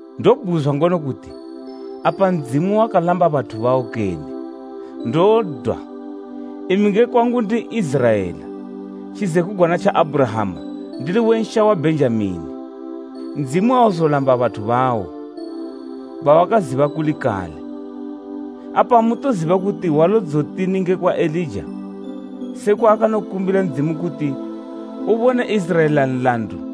Ndobhuzwa ngono kuti, apa Ndzimu wakalamba bathu bawo kene? Ndodwa! Imi nge kwangu ndi N'iziraela, tjizekugwana tja Abhurahama ndili we nsha wa Bhenjamini. Ndzimu auzolamba bathu bawo, bawakaziba kuli kale. Apa amutoziba kuti Hwalo dzotini ngekwa Elija, se kwaanokumbila Ndzimu kuti ubone Iziraela nlandu?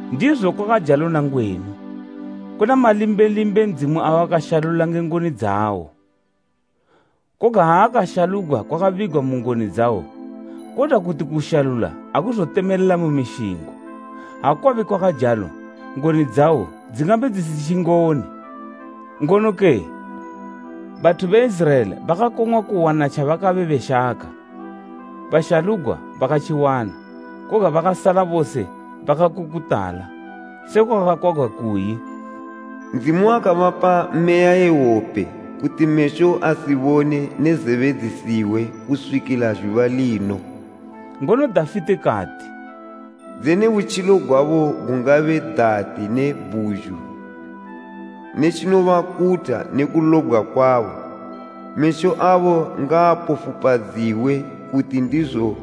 Ndizo kwakajalo nangwenu, kuna malimbelimbe Ndzimu awakashalula nge ngoni dzawo. Koga ha akashalugwa kwakabigwa mu ngoni dzawo, kodwa kuti kushalula akuzotemelela mu mishingo, ha kwabe kwakajalo, ngoni dzawo dzingabe dzisitji ngoni. Ngono kee? Bathu be Iziraela bakakong'wa kuwana tjabakabe beshaka. Bashalugwa bakatjiwana, koga bakasala bose bakakukutala. Sekwa kwakakwagwa kuyi, “Ndzimu wakabapa meya ye wope, kuti mesho asibone ne zebe dzisihwe, kuswikila zhuba lino.” Ngono Dafite kati, “Dzene butjilo gwabo gungabe dati ne bhuzhu, ne tjinobakutha ne kulobgwa kwabo. Mesho abo ngaapofupadziwe, kuti ndizo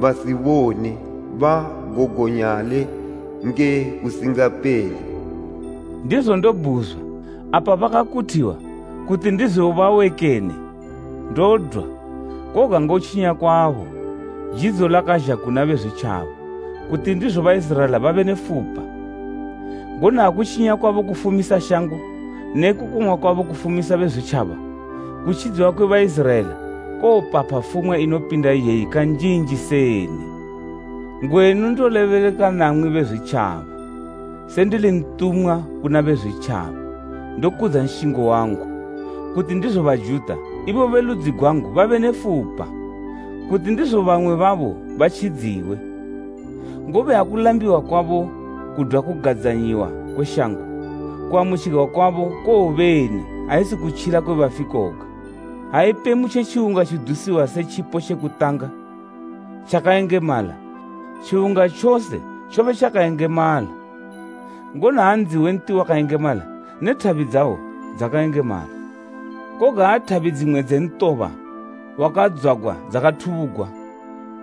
basibone; bagogonyale nge kusingapele.” Ndizo ndobhuzwa, apa bakakuthiwa, kuti ndizo bawe kene? Ndodwa! Koga ngotjinya kwabo, jidzo lakazha kuna Bezwitjaba, kuti ndizo Baiziraela babe ne fupa. Ngono ha kutjinya kwabo kufumisa shango, ne kukong'wa kwabo kufumisa Bezwitjaba. Kutjidziwa kwe Baiziraela kowopapha fumwa inopinda iyeyi kanjinji seni! Ngwenu ndolebeleka namwi Bezwitjaba. Se ndili ntumwa kuna Bezwitjaba, ndokudza nshingo wangu, kuti ndizo Bajuta, ibo be ludzi gwangu babe ne fupa, kuti ndizo bamwe babo batjidziwe. Ngobe ha kulambiwa kwabo kudwa kugadzanyiwa kwe shango, kuamutjigwa kwabo kowobeni ha isi kutjila kwe bafi koga? Ha ipemu tje tjiwunga tjidusiwa se tjipo tje kutanga, tjakayengemala, tjiwunga tjose tjobe tjakayengemala, ngono ha ndzi we nti wakayengemala ne thabi dzawo dzakayengemala. Koga ha thabi dzimwe dze ntoba wakadzwagwa dzakathubugwa,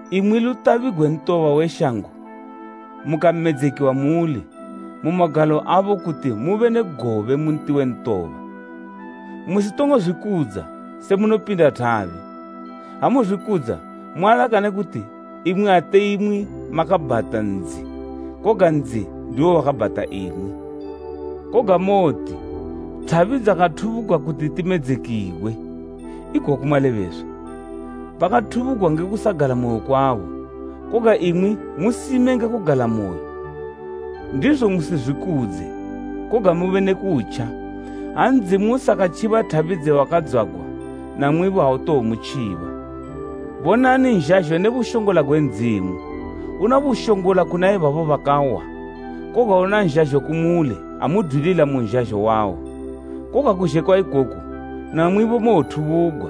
imwi lutabi gwe ntoba we shango mukamedzekiwa muuli, mu magalo abo kuti mube ne gobe mu nti we ntoba, musitongo zwikudza se munopinda thabi. Ha muzwikudza, mualakane kuti imwi ate imwi makabhata ndzi koga ndzi ndiwo wakabhata imwi. Koga mowoti, “Thabi dzakathubugwa kuti timedzekiwe.” Ikoku malebeswa. Bakathubugwa nge kusagalamoyo kwabo, koga imwi musime nge kugalamoyo. Ndizo musizwikudze, koga mube ne kutja. Ha Ndzimu usakatjiba thabi dze wakadzwagwa, namwibo autowomutjiba. Bonani nzhazho ne bushongola gwe Ndzimu. Una bushongola kuna ibabo bakawa, koga una nzhazho kumuli ha mudwilila mu nzhazho wawo. Koga kuzhe kwa ikoku, namwibo mowothubugwa.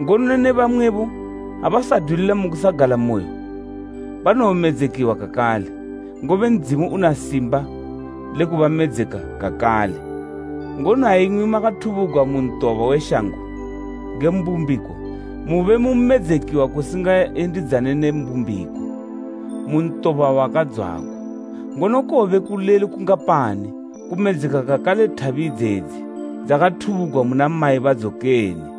Ngono ne bamwebo abasadwilila mu kusagalamoyo banowomedzekiwa kakale, ngobe Ndzimu una simba le kubamedzeka kakale. Ngono ha imwi makathubugwa mu ntoba we shango nge mbumbiko, mube mu medzekiwa kusingayendidzane ne mbumbiko, mu ntoba wakadzwagwa, ngono kowobe kulelu kungapani kumedzeka kakale thabi idzedzi dzakathubugwa muna mayi badzo kene?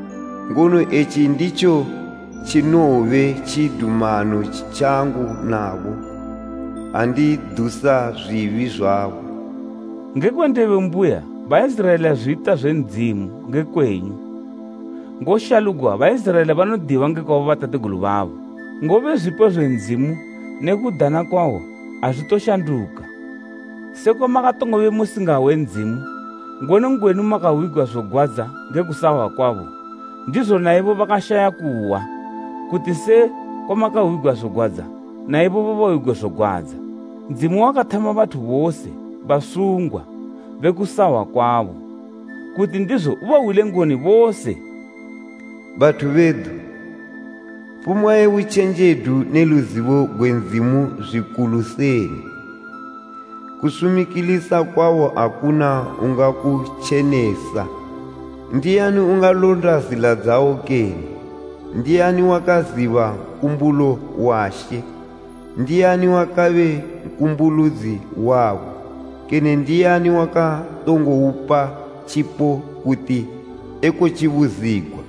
Ngono etji nditjo tjinowobe tjidumano tjangu nabo, ha ndidusa zwibi zwabo.” Nge kwe ndebo mbuya Baiziraela zwita zwe Ndzimu nge kwenyu, ngoshalugwa Baiziraela banodiwa ngekwa bobatategulu babo; ngobe zwipo zwe Ndzimu ne kudana kwawo azwitoshanduka. Sekwa makatongobe musingahwe Ndzimu, ngono ngwenu makahwigwa zogwadza nge kusahwa kwabo, ndizo naibo bakashaya kuhwa kuti se kwamakahwigwa zogwadza, na ibobo bahwigwe zogwadza. Ndzimu wakathama bathu bose basungwa be kusahwa kwabo, kuti ndizo ubahwile ngoni bose. Bathu bedu! Fumwa ye butjenjedu ne luzibo gwe Ndzimu zwikulu seni! Kusumikilisa kwawo akuna ungakutjenesa, ndiani ungalonda zila dzawo kene? “Ndiani wakaziba nkumbulo wa She? Ndiani wakabe nkumbuludzi wabo? Kene ndiani wakatongoupa tjipo kuti ekotjibuzigwa?”